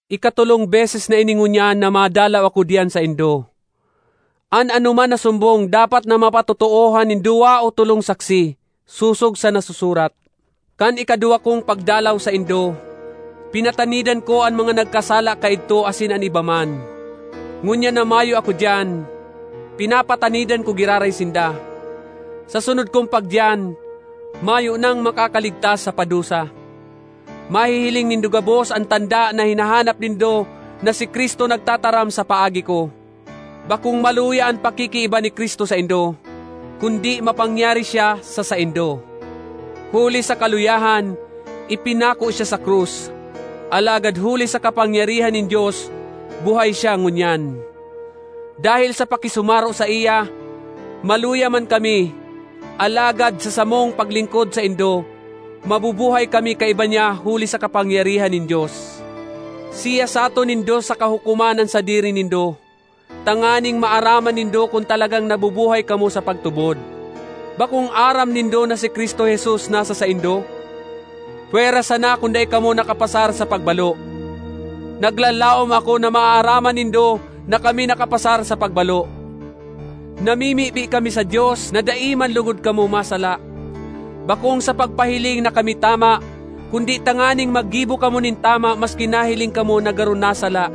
Ikatolong beses na ini ngunyan na madalaw ako diyan saindo. “An anoman na sumbong dapat na mapatotoohan nin duwa o tolong saksi,” sosog sa nasusurat. Kan ikaduwa kong pagdalaw saindo, pinatanidan ko an mga nagkasala kaidto asin an iba man. Ngunyan na mayo ako diyan, pinapatanidan ko giraray sinda: sa sunod kong pagdiyan, mayo nang makakaligtas sa padusa. Mahihiling nindo gabos an tanda na hinahanap nindo na si Cristo nagtataram sa paagi ko. Bakong maluya an pakikiiba ni Cristo saindo, kundi mapangyari siya sa saindo. Huli sa kaluyahan, ipinako siya sa krus, alagad huli sa kapangyarihan nin Dios buhay siya ngunyan. Dahel sa pakisumaro saiya, maluya man kami, alagad sa samong paglingkod saindo, mabubuhay kami kaiba niya huli sa kapangyarihan nin Dios. Siyasaton nindo saka hukoman an sadiri nindo, tanganing maaraman nindo kun talagang nabubuhay kamo sa pagtubod. Bakong aram nindo na si Cristo Jesus nasa saindo?—pwera sana kun dai kamo nakapasar sa pagbalo! Naglalaom ako na maaaraman nindo na kami nakapasar sa pagbalo. Namimibi kami sa Dios na dai man logod kamo masala—bakong sa pagpahiling na kami tama, kundi tanganing maggibo kamo nin tama maski nahiling kamo na garo nasala.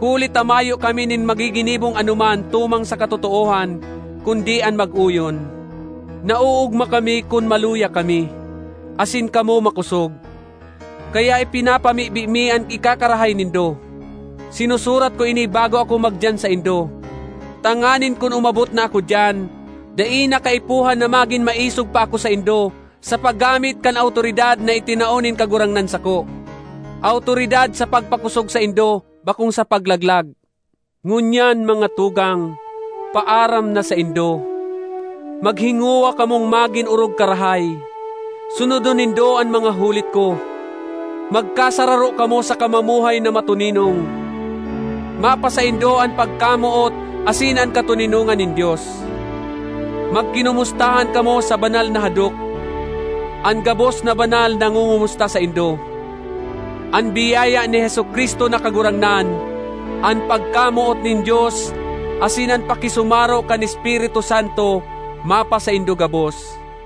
Huli ta mayo kami nin magiginibong anoman tumang sa katotoohan, kundi an mag-oyon. Naoogma kami kun maluya kami, asin kamo makosog. Kaya ipinapamibi mi an ikakarahay nindo. Sinusurat ko ini bago ako magdiyan saindo tanganing kun umabot na ako diyan, dai na kaipuhan na magin maisog pa ako saindo sa paggamit kan awtoridad na itinao nin Kagurangnan sako—awtoridad sa pagpakosog saindo, bakong sa paglaglag. Ngunyan, mga tugang, paaram na saindo! Maghingowa kamong magin orog karahay; sunodon nindo an mga hulit ko; magkasararo kamo saka mamuhay na matoninong. Mapasaindo an pagkamoot asin an katoninongan nin Dios. Magkinomustahan kamo sa banal na hadok. An gabos na banal nangongomusta saindo. An biyaya ni Jesu-Cristo na Kagurangnan, an pagkamoot nin Dios, asin an pakisumaro kan Espiritu Santo mapasaindo gabos.